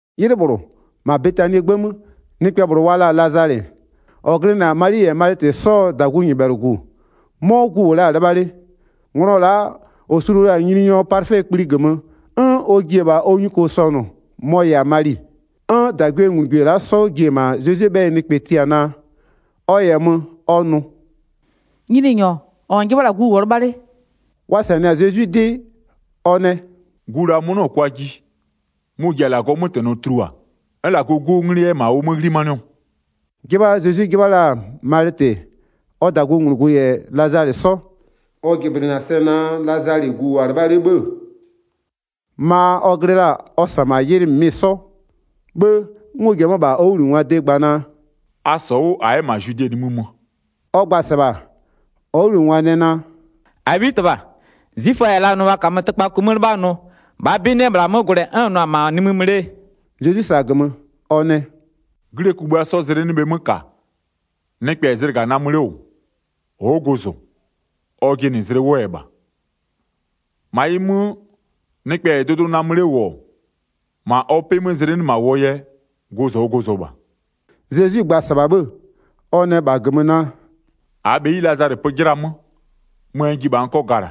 'Ylɩ -bhlʋ, -ma Betanie 'gbë 'mö nɩkpɛ -bhlʋ wa la-a Lazalɩ, -ɔ glɩnɩ-a Mali -yɛ Malɩtɩ 'sɔɔ -dagunyɩbhɛlʋgu, 'mɔ gu -wʋ la-a 'lɩbha 'le. Nglɔ la'a -ɔ sulu la-a Nyininyɔ palɩfɛ kpli -gömö, 'n ɔ ji-e -bha ɔ nyuko sɔnʋ mɔ-ɔ -yɛ-a Mali. 'N -dagwienglugwie la'a 'sɔ ji-e -ma Zezwie 'bhɛyɩ nɩkpɛ tia naa, ɔ -yɛ mö ɔ nʋ: “Nyininyɔ, -ɔ -n 'jɩbha la-a, gu -wʋɔ 'lɩbha 'le.” Wa -sanɩ-a Zezwi 'dɩ, ɔ nɛ: “Gu -la mʋ-ʋ 'nɩɔ-ɔ kwaa ji, mʋ-ʋ ji-a -Lagɔɔ 'mötɛnɔ tulua, 'n -Lagɔɔ 'Guo 'nglɩ 'yɛ-ɛ -ma ʋ 'mö 'ghlimanɩɔ.” 'Jɩbha Zezwi 'jɩbha la-a Malɩtɩ-ɛ, ɔ -dagunglugu -yɛ Lazalɩ 'sɔ. Ɔ jɩblɩnɩ-a sɛ naa Lazalɩ gu -wʋɔ 'lɩbha 'le 'bhë-ë, ma ɔ glɩ la-a ɔ -sa -ma ylɩ -mɩmɩ 'sɔ. 'Bhë 'n ɔ ji-e 'mö-a -bha ɔ 'wʋbhlinɩngwaa de gba naa: “A -sɔ 'wʋ -a 'yɛ -ma Zwide nimï mö.” Ɔ gba-a -sɩbha, ɔ 'wʋbhlinɩngwa nɛ naa: “-Abhitɩbha, 'zwiföa -yɛ la nʋ wa -kamö tɩkpaku 'mö 'lɩbha nʋ, -bhaa 'bɩ 'nɩ-ɛ -bhla 'mö gwlɛ, 'n -n nʋ-a -n 'yɛ -ma nimï möö?” Zezwi -sa-a -gömö, ɔ nɛ: “'Glie kugbïa 'sɔ zlɩ 'nɩ bhe 'mö -ka? Nɩkpɛ -yɛ zlɩga namö 'le -wʋ, ɔ'ɔ gozo, ɔ jɩnɩ zlɩ 'wʋɔ yɛ -bha. 10-Ma ɩ 'mö, nɩkpɛ -yɛ dʋdʋ namö 'le -wʋ-ɔ, -ma ɔ 'pɩ 'mö zlɩ 'nɩ -ma -wʋɔ yɛ, gozo ɔ gozo -bha.” Zezwi gba-a -sɩbha 'bhë, ɔ nɛ -bha -gömö naa: “-Aa bheyi Lazalɩ pö 'jɩla 'mö, möö n ji -bha n 'kɔ gala.”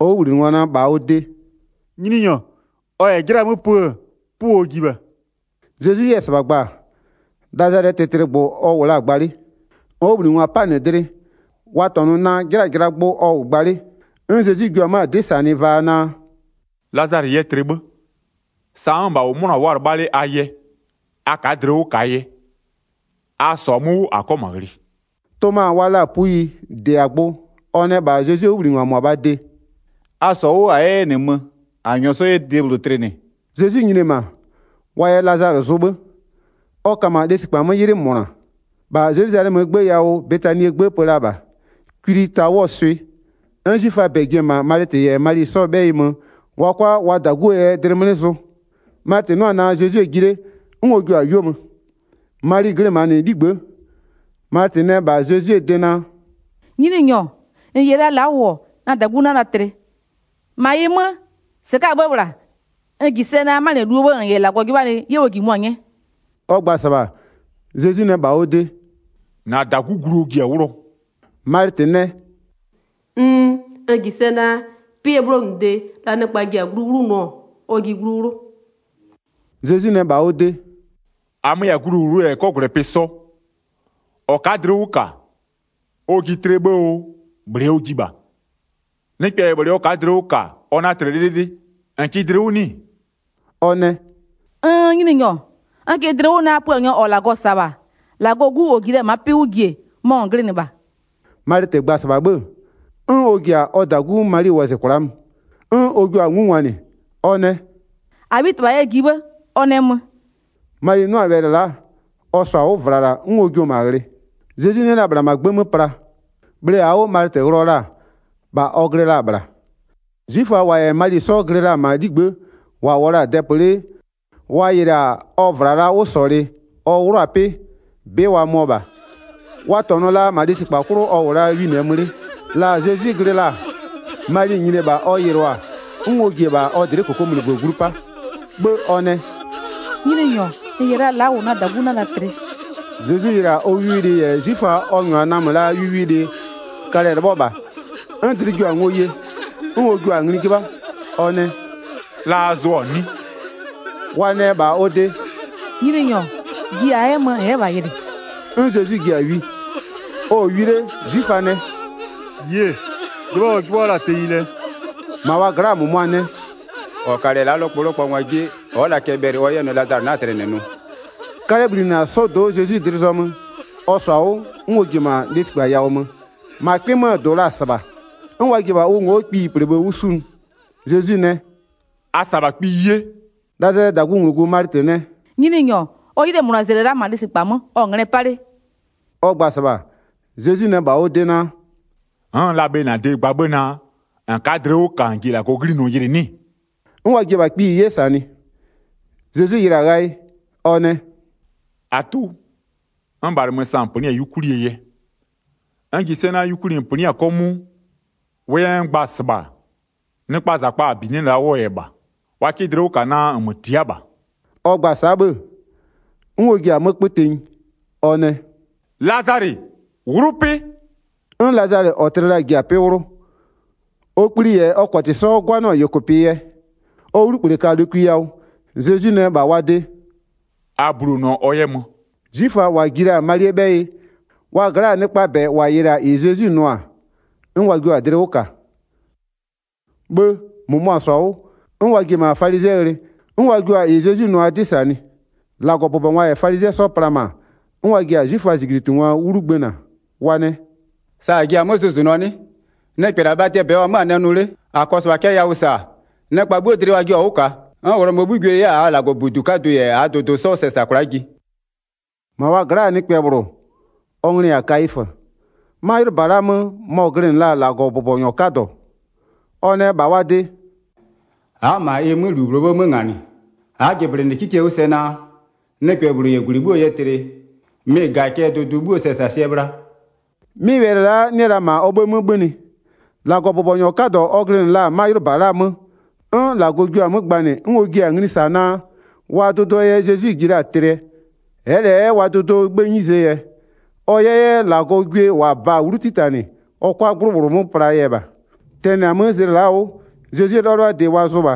Ɔ 'wʋbhlinɩngwa nɛ -bha ɔ de: “Nyininyɔ, ɔ -yɛ 'jɩla 'mö pö-ö, 'pʋɔ ɔ ji -bha.” Zezwi 'yɛ-ɛ -sɩbha gba-a, Lazalɩɛ tlɩtlɩgbʋ ɔ -wʋ la-a gba 'le. Ɔ 'wʋbhlinɩngwa 'pa-a -nɩ dlɩ wa -tɔnʋ naa 'jɩlaa jɩlaa gbʋ ɔ gba la. 'N Zezwi jua 'mö-a 'dɩ -sanɩ vaa naa: “Lazalɩ yɛ tlɩ 'bhë. Sa n'n-n -bha -wʋ, 'mʋna-a wʋ'ʋ-a 'lɩbha 'le a yɛ, a ka'a dlɩ 'wʋ -kaa yɛ. A -sɔ-a 'mö 'wʋ -a 'kɔ -ma ghlɩ.” Toma wa la 'yɛ-a puyi -dɩ-a gbʋ, ɔ nɛ -bha Zezwie 'wʋbhlinɩngwa -mʋabhaa de: “A -sɔ 'wʋ -a 'yɛ 'yɛ -nɩ mö, -a -nyɔɔ 'sɔ 'yɛ debhlʋ tlɩnɩ.” Zezwi nyini-e -ma-a, wa yɛ Lazalɩ zʋ 'bhë ɔ ka -ma lesikpa 'mö 'ylɩ -mʋna. 18-Bha Zelwizalɛmöö 'gbë yawʋ Betanie gbë pö la -bha, kwili ta 'wʋɔ swɩ. 'N 'zwiföaa -bɛ ji-e -ma Malɩtɩ -yɛ Mali 'sɔɔ 'bhɛyɩ mö wa 'kʋa wa -daguo yɛ dlɩ 'mlɩ zʋ. Malɩtɩ 'nʋ-ɔ naa Zezwi-e ji 'le, 'n ɔ jio-a 'yuo mö, Mali glɩ -ma -nɩ 'ligbë'ë. Malɩtɩ nɛ -bha Zezwie de naa: “Nyininyɔ, -n -yɛ la la'a -wʋ-ɔ, na -dagu 'na la tlɩ. 22-Ma ɩ 'mö, -sɩka'a 'bhë -bhla, n -ji sɛ naa, 'manɩluo bhë -n -yɛ -Lagɔ 'jɩbhanɩ 'ye ʋ -jimʋ-a 'nyɛɛ.” Ɔ gba-a -sɩbha, Zezwi nɛ -bha ɔ de: “-Na -dagu glu ɔ ji-a 'wlʋɔ.” Malɩtɩ nɛ: “Nn, n -ji sɛ naa, pɩɛ 'bhlonʋde, la nɩkpa ji-a glu 'wlʋnʋɔ ɔ ji glu 'wlʋ.” Zezwi nɛ -bha ɔ de: “-Amö-ö -yɛ-a gluwlʋwlʋɛ -yɛ 'kɔgwlɛpɩ sɔ, -ɔ ka'a dlɩ 'wʋ -ka, ɔ ji tlɩɛ 'bhë oo -bhlɩɛ ɔ ji -bha. Nɩkpɛ -yɛ -bhlɩ ɔ ka'a dlɩ 'wʋ -ka-a ɔ 'na tlɩ 'lɩlɩlɩ. -N kɩ dlɩ 'wʋ 'nɩ-ɩ?” Ɔ nɛ: “Nn, Nyininyɔ, n kɩ dlɩ 'wʋ naa Puanyɔ -ɔ -Lagɔ -sa-a -bha, -Lagɔɔ Gu -ɔ ji la-a ma'a 'pɩ 'wʋ jie, mɔ -n glɩnɩ -bha.” Malɩtɩ gba-a -sɩbha 'bhë, 'n ɔ ji-a ɔ -dagu Mali wɔzɩ kwla'a mö, 'n ɔ jio-a 'ngungwanɩ, ɔ nɛ: “-Abhitɩbha yɛ ji 'bhë, ɔ nɛ mö.” Mali 'nʋ-a wɛlɩ la'a, ɔ -sɔ-a 'wʋ -vlala 'n ɔ jio-o -ma ghlɩ. Zezwi 'nɩ-ɛ la -bhla -ma 'gbë 'mö pla, bhle -aa 'wʋ Malɩtɩ ghlɩɔ la-a, -bha ɔ glɩ la-a -bhla. 'Zwiföa -wa -yɛ Mali 'sɔ glɩ la-a -ma 'ligbë'ë, -wa -wʋɔ la-a dɛpö 'le yɩlɩ-a ɔ -vlalaa 'wʋsɔlɩ ɔ 'wlʋ-a 'pɩ-ɛ, 'bɩ wa möɔ -bha, wa -tɔnʋ la -ma lesikpa 'klʋ ɔ -wʋ la winɩɛ mö 'le. La Zezwi glɩ la-a, Mali nyini-e -bha ɔ yɩlɩɔ-a, 'n ɔ ji-e -bha ɔ dlɩ'ɩ -kokomunigbö glu 'pa, 'bhë ɔ nɛ: “Nyininyɔ, -n -yɛ la la'a -wʋ na -dagu 'na la tlɩ.” Zezwi yɩlɩ-a ɔ wiwilɩ -yɛ 'zwiföa ɔ -nyʋa namö la-aa wiwilɩ-ɛ, kalɛ-ɛ 'lɩbhɔ -bha, 'n dlɩ jio-a ngo ye. 'N ɔ jua-a ngli 'jɩbha, ɔ nɛ: “La a zʋɔ-a 'nɩ?” Wa nɛ -bha ɔ de: “Nyininyɔ, ji -a 'yɛ mö -n 'yɛ -bha yɩlɩ.” 'N Zezwi ji-a wi. Ɔ-ɔ wi 'le 'zwiföa nɛ: “Yie, 'jɩbha ɔ 'jɩbhɔ la-a tenyi lɛ!” 37-Ma wa gla'a -mʋmʋa nɛ: “-Ɔ kalɩ-ɛ la'a 'lɔkpɔlɔkpɔnyɔ 'jie-e, ɔ'ɔ la cɛ bhɛlɩ ɔ 'yɛ nʋ naa Lazalɩ 'na-a tlɩ -nɩ nʋ?” 'Kalɛ bhlinɩ-a 'sɔdo'o Zezwi dlɩ zɔmö, ɔ -sɔ-a 'wʋ, 'n ɔ ji-e -ma lesikpa yawʋ mö. -Ma 'kpɩ 'möö -dʋ la-a -sɩbha, 'n wa ji-e -bha ʋ ngo'o kpiyi -plebhë 'wʋ 'sunʋ. Zezwi nɛ: “A -sa -bha kpiyi 'ye.” Lazalɩɛ -dagunglugu Malɩtɩ nɛ: “Nyininyɔ, ɔ 'ylɩɛ -mʋnazlɩ-ɛ la'a -ma lesikpa 'mö, ɔ-ɔ nglɛ 'pa 'le.” Ɔ gba-a -sɩbha, Zezwi nɛ -bha ɔ de naa: “N'n-n la bhe -bha -na de gba naa, -n ka'a dlɩ 'wʋ -ka -n ji -Lagɔɔ 'ghlinɔ yɩlɩ nʋ 'nɩ-ɩ?” 'N wa ji-e -bha kpiyi 'ye -sanɩ. Zezwi yɩlɩ-a ghayɩ ɔ nɛ: “-Atʋ, n -bhalɩmö sa -n -pönɩ'ɩ-a 'yukwlie yɛ. N -ji na-a sɛ naa yukwli -n -pönɩ'ɩ-a 'kɔmʋʋ, -wʋʋ yɛ n gba-a -sɩbha, nɩkpaa -zakpa -a -binɩ'ɩ-ɛ la'a 'wʋɔ yɛ -bha. Wa 'kɩ dlɩ 'wʋ -ka naa -nmö tia'a -bha.” Ɔ gba-a sa'a 'bhë, 'n ɔ ji-a 'mö 'kpö tenyi, ɔ nɛ: “Lazalɩ! 'Wlʋ 'pɩ!” 'N Lazalɩ -ɔ tlɩ la-a ji-a 'pɩ 'wlʋ, ɔ kpli -yɛ ɔ -kɔtɩ 'sɔ 'gwanɩɔ-ɔ -yʋkʋpɩ yɛ, ɔ 'wlukple ka lokwi yawʋ. Zezwi nɛ -bha wa de: “A bulonʋɔ ɔ 'yɛ mö.” 'Zwiföa -wa ji la-a Malie 'bhɛyɩ, wa gla'aa nɩkpaa -bɛ -wa yɩlɩ-a -ɩ Zezwi nʋ-a, 'n wa jio-a dlɩ 'wʋ -ka. 'Bhë -mʋmʋa -sɔ-a 'wʋ, 'n wa ji-e -ma falizɩɛ ghlɩ, 'n wa jua-a -ɩ Zezwi nʋ-aa 'dɩ -sanɩ. 47-Lagɔbʋbɔngwa -yɛ falizɩɛ 'sɔ pla-a -ma, 'n wa ji-a 'zwiföaa -zijlitungwa 'wlu gbëna. Wa nɛ: “Sa -a ji-a 'mö zʋzʋnʋɔ 'nɩ? Nɩkpɛ -la bhatɩɛ -bɛ ɔ -wʋ-ɔ 'mö-a nɛ nʋ 'le. 48-A -kɔɔ -sɩbha cɛ yawʋ -sa, nɩkpa 'bhuo dlɩ wa jio-a 'wʋ -kaa, 'n Ghlɔmöö 'bhugwie 'yɛ-a -aa -Lagɔbudu 'kadʋ -yɛ -aa dʋdʋ 'sɔ sɛ -sa kwla'a ji.” 49-Ma wa gla'aa nɩkpɛ -bhlʋ, ɔ nglɩ-ɩ -yɛ-a Kayifö, 'ma 'ylʋba la'aa 'mö mɔ-ɔ glɩnɩ la-a -Lagɔbʋbɔnyɔ 'kadɔ. Ɔ nɛ -bha wa de: “A'a -ma ɩ 'mö -lu -bhlʋɔ 'bhë 'mö -nganɩ. A'a jɩblɩnɩ 'kikie 'wʋ sɛ naa, nɩkpɛ -bhlʋ 'yɛ -gwlɩ 'bhuoo yɛ tlɩ, mɩ-ɩ -ga-a cɛ dʋdʋ 'bhuoo sɛsasɩɛ bhla.” 'Mɩ wɛlɩ la'a 'nɩ-ɛ la -ma ɔ 'bhëë 'mö 'bhönɩ, -Lagɔbʋbɔnyɔ 'kadɔ ɔ glɩnɩ la-a 'ma 'ylʋba la'aa 'mö, 'n -Lagɔ jio-a 'mö gbanɩ 'n ɔ jiɩ-a ngli -sa naa, wa dʋdʋɔ yɛ Zezwi ji la-a tlɩɛ. Ɛ'ɛ -lɛ 'yɛ wa dʋdʋɔ 'bhëë 'nyizee yɛ, ɔ 'yɛ 'yɛ -Lagɔɔ gwie -wa ba-a 'wlu 'titanɩ, ɔ 'kʋa 'gblʋ -bhlʋ 'mö pla-aa yɛ -bha. Tɛnɩ-a 'mö zlɩ la'a 'wʋ, Zezwie 'lɩbhalɩbhadɩ wa zʋ -bha.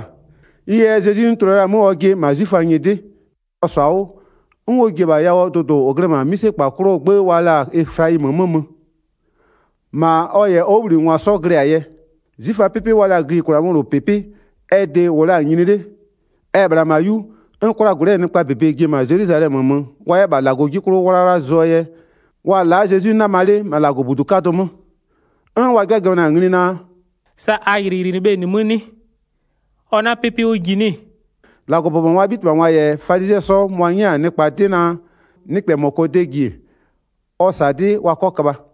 Ɩ yɛ Zezwi 'nɩ tulua la-a 'mö ɔjɩ -ma 'zwiföaa nyɩdɩ. Ɔ -sɔ-a 'wʋ, 'n ɔ ji-e -bha yawʋɔ dʋdʋ -ʋ glɩ-ɛ -ma 'mïsekpa 'klʋɔ 'gbë wa la-a Eflayimöö 'mö mö, -ma ɔ -yɛ ɔ 'wʋbhlinɩngwa 'sɔ glɩ-a yɛ. 'Zwiföaa 'pɩpɩ wa la-a gïyikwlaa 'möwlʋpɩpɩ, ɛ de-e -wʋ la-a nyini 'le, ɛ-ɛ -bhla -ma 'yu 'n 'kwlagwlɩ'ɩɛ nɩkpaa -bebe ji-e -ma Zelwizalɛmö mö wa 'yɛ -bha -Lagɔ 'ji 'klʋ 'wlawla zʋɔ yɛ. Wa-a la'a Zezwi 'nama 'le -ma -Lagɔbudu 'kadʋ 'mö, 'n wa 'jɩbhajɩbhanɩ-a ngli naa: “Sa a yɩlɩyɩlɩnɩɩ bhe -nɩ 'mö 'nɩ? Ɔ 'na 'pɩpɩ 'wʋ ji 'nɩ-ɩ?” 57-Lagɔbʋbɔngwaa 'bhitɩbhangwa -yɛ falizɩɛ 'sɔ, mʋa-a 'nyɛ la-a nɩkpa 'dɩ naa, nɩkpɛ -mɔ -kɔɔ de -ji ɔ -sa 'dɩ wa 'kɔ köbha.